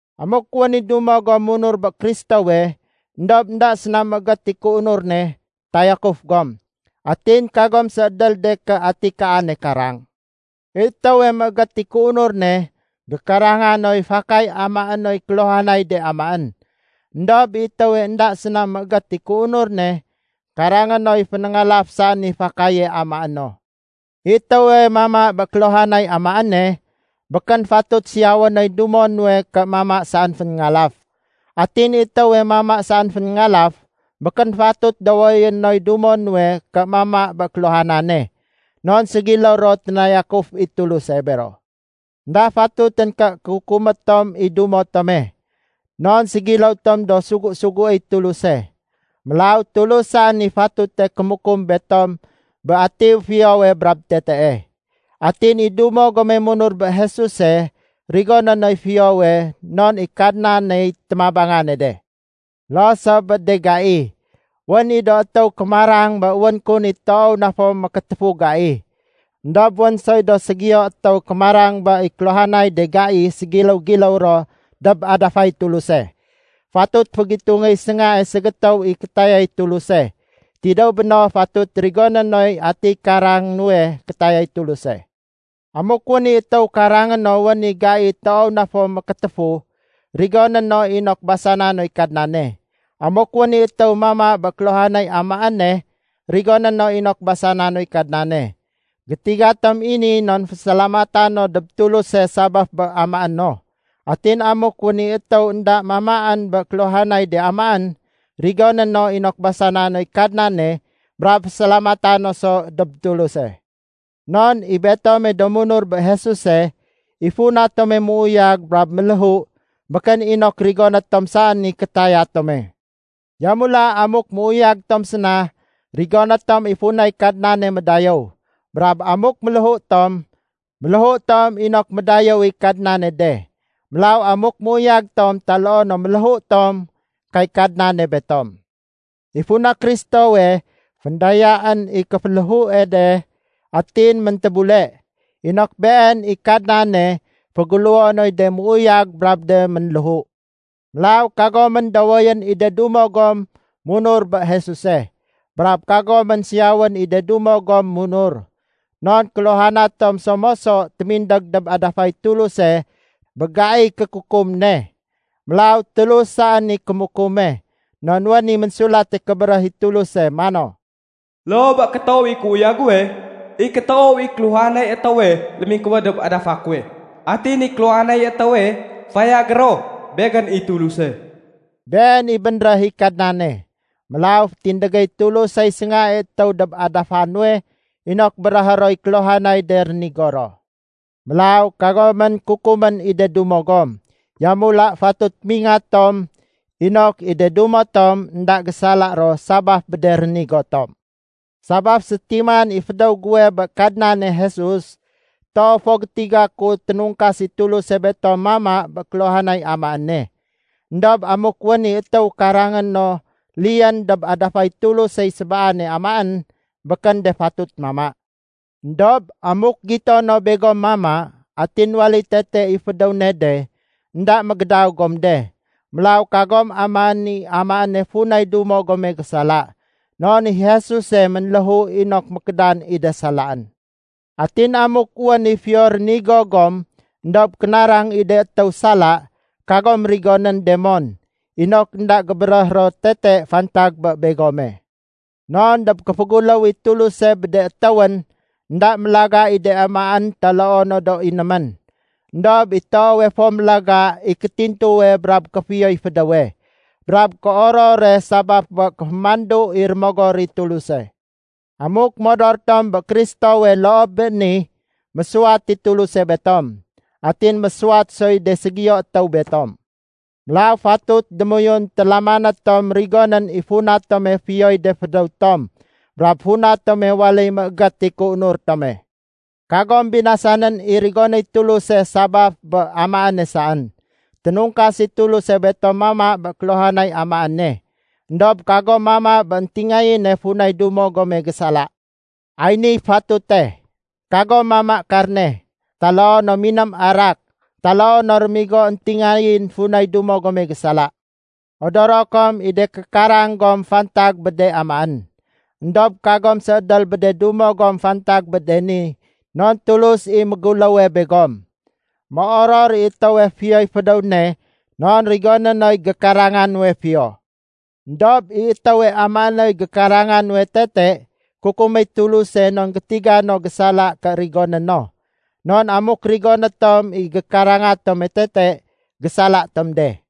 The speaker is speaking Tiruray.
Amuk wén i dumo gom munur bé Kristowe, éndob énda séna méégét i kéunur ne, tayakuf gom. Atin kagom séédél de ké ati kaane karang. I étéwe méégét i kéunur ne, gékaranga noy fakay amaé noy kéluhanay de amaén. Endob i étéwe énda séna méégét i kéunur ne, karangé noy fénéngalaf saén i fakaye amaé no. I étéwe mama bé kéluhanay amaéne, békén fatut siyawé noy dumo nuwe ké mama saén fénéngalaf. Atin i étéwe mama saén fénéngalaf, békén fatut dowoyé noy dumo nuwe ké mama bé kéluhanane. Non ségiléw ro ténayakuf i Tuluse bero. Enda fatutén ké kukumé tom i dumo tome. Non ségiléw tom do sugu-suguéy Tuluse. Mélaw Tulus saén i fatute kémukum betom bé ati fiyowe brab tetee. Atin i dumo gome munur bé Jesuse rigoné noy fiyowe non i Kadnaney témabanga ne de. Loo so bé de gai. Wén i do étéw kémarang bé wén kun i toow na fo mékétéfu gai. Endob wén soy do ségiyo étéw kémarang bé i kéluhanay de gai fantay-fantay ro dob adafay Tuluse. Fatut fégitungéy séngae ségétéw i kétayay Tuluse. Tidéw béno fatut rigoné noy ati karangé nuwe kétayay Tuluse. Amuk wén i étéw karangé no wén i gai toow na fo mékétéfu, rigoné no inok basana noy Kadnane. Amuk wén i étéw mama bé kéluhanay amaéne, rigoné no inok basana noy Kadnane. Gétiga tom i ni non fésalamata no dob Tuluse sabaf bé amaé no. Atin amuk wén i étéw énda mamaén bé kéluhanay de amaén, rigoné no inok basana noy Kadnane brab fésalamata no so dob Tuluse. Non i betome do munur bé Jesuse, i funa tome méuyag brab méléhu békén inok rigoné tom saén i kétaya tome. Yamula amuk méuyag tom séna, rigoné tom i funay Kadnane médayéw. Brab amuk méléhu tom, méléhu tom inok médayéw i Kadnane de. Mélaw amuk méuyag tom taloo no méléhu tom, kay Kadnane betom. I funa Kristowe féndayaén i kéféléhue de atin méntébule, inok Been i Kadnane féguléwo noy de méuyag brab de ménléhu. Mélaw kagomén dowoyén i de dumo gom munur bé Jesuse. Brab kagomén siyawén i de dumo gom munur. Non kéluhana tom so moso témindég dob adafay Tuluse bé gaiy kékukum ne. Mélaw Tulus saén i kémukume. Non wén i Ménsulate Kébéréh i Tuluse mano, “Loo bé kétoow i kéuyag guwe, i kétoow i kéluhanay étéwe lémingkuwéd dob adafa kuwe. Atin i kéluhanay étéwe fayagé ro Begén i Tuluse.” Been i bénréh i Kadnane. Mélaw fétindégéy Tulusey séngae étéw dob adafa nuwe inok béréhé roy kéluhanay de rénigo ro. Mélaw kagomén kukumén i de dumo gom. Yamula fatut mingat tom inok i de dumo tom énda gésala ro sabaf bé de rénigo tom. Sabaf sétiman i fédéw guwe bé Kadnane Jesus, toow fo gétiga ku ténungkas i Tuluse betom mama bé kéluhanay amaéne. Endob amuk wén i étéw karangé no liyén dob adafay Tulusey sébaane amaén, békén de fatut mama. Endob amuk gito no begom mama, atin waléy tete i fédéw ne de, énda mégédaw gom de. Mélaw kagom amaén i amaéne funay dumo gome gésala. Non i Jesuse ménléhu inok mékédan i de salaén. Atin amuk wén i fiyo rénigo gom éndob kénarang i de étéw sala, kagom rigonén de mon, inok énda gébéréh ro tete fantag bé begome. Non dob kéféguléw i Tuluse bé de étéwén, énda mélaga i de amaén taloo no do inémén. Endob i toowe fo mélaga i kétintuwe brab kéfiyoy fédéwe, brab kéorore sabaf bé kéfémandu i Rémogor i Tuluse. Amuk modor tom bé Kristowe loo bé ni, mésuwat i Tuluse betom. Atin mésuwat soy de ségiyo étéw betom. Mélaw fatut démoyun télamané tom rigonén i funa tome fiyoy de fédéw tom brab funa tome waléy méégét i kéunur tome. Kagom binasanén i rigonéy Tuluse sabaf bé amaéne saén. Ténungkas i Tuluse betom mama bé kéluhanay amaéne. Endob kagom mama bé éntingayéne funay dumo gome gésala. Ay niy fatute. Kagom mama karne, taloo no miném arak taloo no rémigo éntingayén funay dumo gome gésala. Odoro kom i de kékarang gom fantag bé de amaén. Endob kagom séédél bé de dumo gom fantag bé de ni non Tulus i méguléwe begom. Méoror i étéwe fiyoy fédéw ne non rigoné noy gékaranga nuwe fiyo. Endob i étéwe amaé noy gékaranga nuwe tete, kukuméy Tuluse non gétiga no gésala ké rigoné no. Non amuk rigoné tom i gékaranga tome tete, gésala tom de.